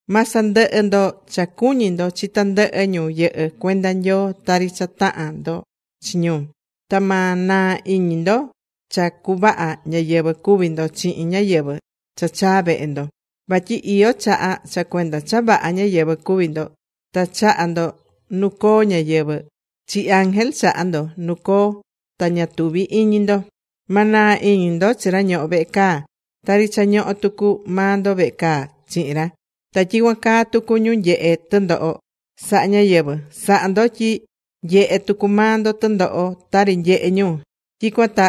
Ma sandɨhɨ ndo cha cuñí ndo chi tandɨhɨ ñu yɨhɨ́ cuenda Nyoo tari cha tahan ndo chi ñu. Ta ma naa iñi ndo cha cuvaha ñáyɨvɨ cuví ndo chihin ñáyɨvɨ cha chaá vehe ndo. Vatyi iyó chaha cha cuenda cha vaha ñáyɨvɨ cuví ndo, ta chaha̱ ndo nu coo ñáyɨvɨ; chi ángel, chaha̱ ndo nu coo, ta ña tuvi̱ iñi ndo. Ma naa iñi ndo chi ra ñohó vehe caa tari cha ñohó tucu maa ndo vehe caa chihin ra. Ta tyicuan caa tucu ñu nyehé tɨndoho sahá ñáyɨvɨ. Sa̱ha ndo tyi nyehé tucu maa ndo tɨndoho tari nyehé ñu, tyicuan ta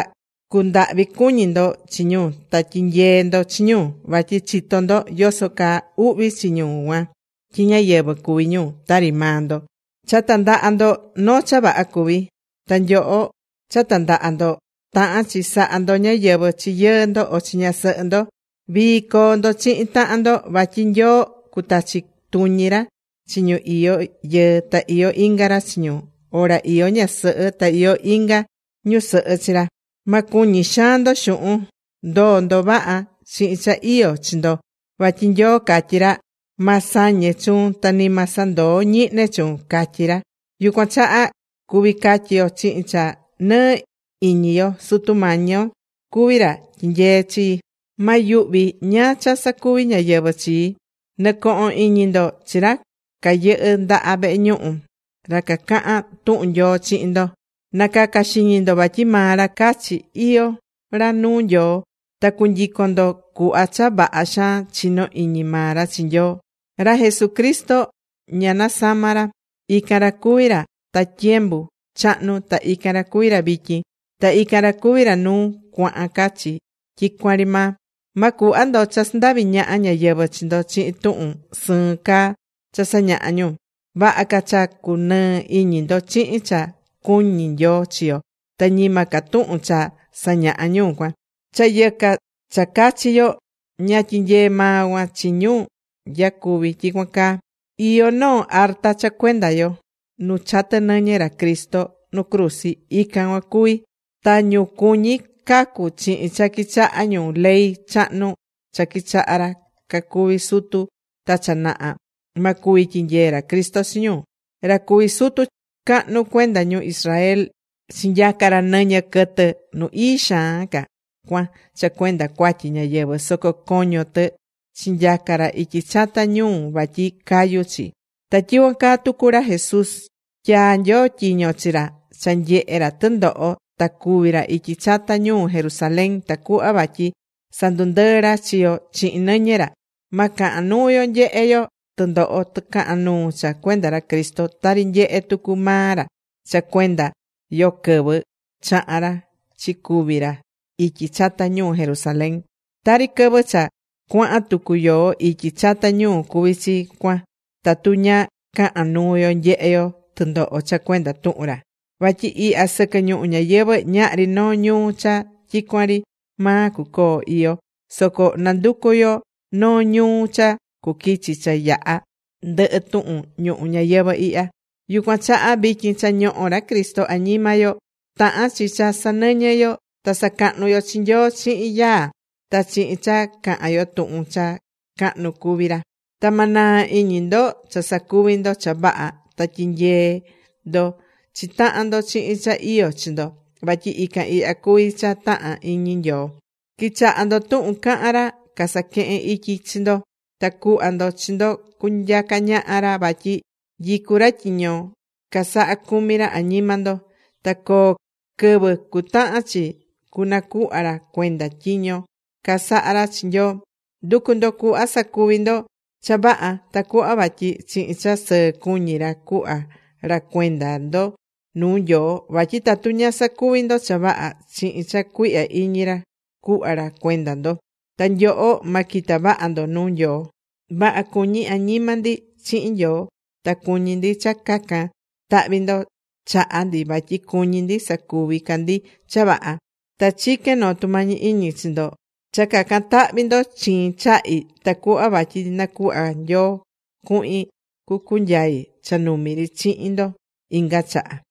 cundahvi cuñi ndo chi ñu ta tyi̱nyee ndo chi ñu. Vatyi chitó ndo yoso caa uhvi chi ñu cuan tyi ñáyɨvɨ cuví ñu tari maa ndo. Cha tandaha ndo, noo cha vaha cuví. Ta nyoho cha tandaha̱ ndo tahán chi saha ndo ñáyɨvɨ chi yɨɨ ndo o chi ñasɨhɨ ndo. Vii coo ndo chihin tahan ndo, vatyi Nyoo cutachi tuñi ra chi ñu iyó yɨɨ ta iyó inga ra chi ñu, o ra iyó ñasɨhɨ ta iyó inga ñusɨhɨ chi ra. Ma cuñi xaan ndo xuhun. Ndo̱o ndo vaha chihin cha iyó chi ndo, vatyi Nyoo catyí ra: “Ma sañe chuun ta ni ma sandoo ñihne chuun”, catyí ra. Yucuan chaha cuví catyi yo chihin cha nɨɨ iñi yo: Sutu Mañi yo cuví ra tyinyeé chii, Ma yuhvi ñáá cha sacuvi ñáyɨvɨ chii. Nɨ̱cohon iñi ndo chi ra cayɨhɨ́ ndaha vehe ñuhu, ra cacahán tuhun Nyoo chihin ndo. Na̱caca xiñi ndo vatyi maa ra cachi iyó ra nuu Nyoo, ta cu̱nyicon ndo cuhva cha vaha xaan chinó iñi maa ra chi Nyoo. Ra Jesucristo ña nasamá ra. Ican ra cuví ra ta tyembu chahnu, ta ican ra cuví ra vityin. Ta ican ra cuví ra nuu cuahan ca chi tyicuan ri maa. Ma cuhva ndo cha sandavi ñaha ñáyɨvɨ chi ndo chihin tuhun sɨɨn caa cha sañahá ñu. Vaha ca cha cu nɨɨ iñi ndo chihin cha cuñí Nyoo chi yo, ta ñima ca tuhun cha sañahá ñu cuan: cha yɨca cha cachi yo. Ña tyinyeé maa cuan chi ñu nyacuví tyicuan caa. Iyó noo arta cha cuenda yo. Nu chatɨ nɨñɨ ra Cristo nu cruzi, ican cuan cuví. Ta ñu cuñí cacu chihin cha quichahá ñu ley chahnu cha quichaha̱ ra cacuvi̱ sutu ta cha naha, ma cuvi tyinyee ra Cristo chi ñu. Ra cuví sutu cahnu cuenda ñu Israel chinyaca̱ ra nɨñɨ quɨtɨ Nu Ii Xaan Ca cuan cha cuenda cuatyi ñáyɨvɨ, soco coño tɨ chinyaca ra ityi chata ñuu vatyi cayu chi. Ta tyicuan caa tucu ra Jesús, tyaa̱ Nyoo tyiño chi ra cha nyehe ra tɨndoho ta cúvi ra ityi chata ñuu Jerusalén, tacuhva vatyi sandundɨɨ ra chi yo chihin nɨñɨ ra. Ma cahan nuu yo nyehe yo tɨndoho tɨcahan nuu cha cuenda ra Cristo, tari nyehe̱ tucu maa ra cha cuenda yo quɨvɨ chaha̱n ra chicúvi ra ityi chata ñuu Jerusalén. Tari quɨvɨ cha cuahan tucu yoó ityi chata ñuu cuví chi cuan tatu ña cahán nuu yo nyehe yo tɨndoho cha cuenda tuhun ra. Vatyi ihya sɨquɨ ñuhu ñayɨvɨ̱, ñahri noo ñuu cha tyicuan ri maa cucoo iyó. Soco nanducú yo noo ñuu cha cuquichi, cha yaha ndɨhɨ tuhun ñuhu ñayɨvɨ̱ ihya. Yucuan chaha vityin cha ñohó ra Cristo añima yo, tahán chi cha sanɨñɨ yo ta sacahnu yo chi Nyoo chihin yaa, ta chihin cha cahan yo tuhun cha cahnu cuví ra. Ta ma naa iñi ndo cha sacuví ndo cha vaha. Ta tyinyee ndo chi tahan ndo chihin cha iyó chi ndo, vatyi ican ihya cuví cha tahán iñi Nyoo. Qui̱chaha ndo tuhun cahán ra casaquehén ityi chi ndo, ta cu̱hva ndo chi ndo cunyaca ñaha ra vatyi nyicú ra tyiño casahá cumi ra añima ndo. Ta coo quɨvɨ cutahan chi cunacuhva ra cuenda tyiño casaha̱ ra chi Nyoo. Ndu̱cu ndo cuhva sacuvi ndo cha vaha, tacuhva vatyi chihin cha sɨɨ cuñi ra cuhva ra cuenda ndo nuu Nyoo, vatyi tatu ña sacuví ndo cha vaha, chihin cha cuihya iñi ra cuhva ra cuenda ndo, ta nyoho, ma quita vaha ndo nuu Nyoo. Vaha cuñí añima ndi chihin Nyoo, ta cuñí ndi cha cacan tahvi ndo chaha ndi vatyi cuñí ndi sacuví ca ndi cha vaha. Ta chiquén noo tumañi iñi chi ndo cha cacan tahvi ndo chiin chahi tacuhva vatyi nacuhva Nyoo cuhin cucunyai cha numi ri chihin ndo inga chaha.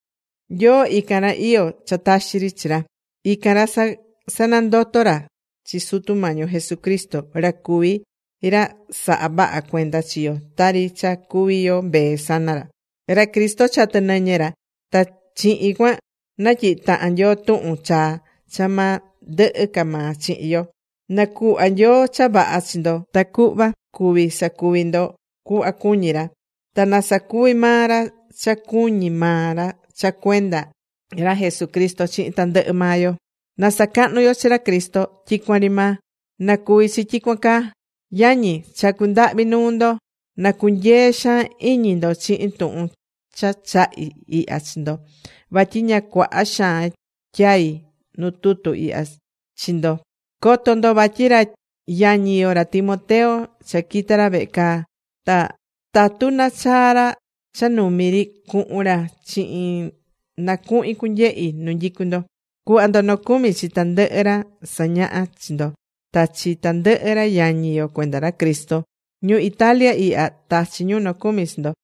Nyoo ican ra iyó cha taxi chi ra, ican ra sanandoto̱ ra chi Sutu Mañi yo Jesucristo, ra cuví ra sahá vaha cuenda chi yo tari cha cuví yo mbee sana ra. Ra Cristo chatɨ̱ nɨñɨ ra, ta chihin cuan natyihi̱ tahan Nyoo tuhun chaa cha ma ndɨhɨ ca maa chihin yo. Na cuhva Nyoo cha vaha chi ndo tacuhva cuvi sacuvi ndo cuhva cuñí ra. Ta na sacuvi maa ra cha cuñí maa ra cha cuenda ra Jesucristo chihin tandɨhɨ maa yo. ¡Na sacahnu yo chi ra Cristo tyicuan ri maa! ¡Na cuvi chi tyicuan caa! Yañi, chacú ndahvi nuu ndo, na cunyee xaan iñi ndo chihin tuhun cha chahí ihya chi ndo, vatyi ña cuaha xaan tyai̱ nu tutu ihya chi ndo. Co̱to ndo vatyi ra yañi yo, ra Timoteo, cha quita̱ ra vehe caa. Ta tatu nachaa ra cha numi ri, cuhun ra chihin, na cuhin cunyehi nu nyicú ndo. Cu̱hva ndo nocumi chi tandɨhɨ ra sañahá chi ndo, ta chi tandɨhɨ ra yañi yo cuenda ra Cristo. Ñu Italia ihya, tachí ñu nocumi chi ndo.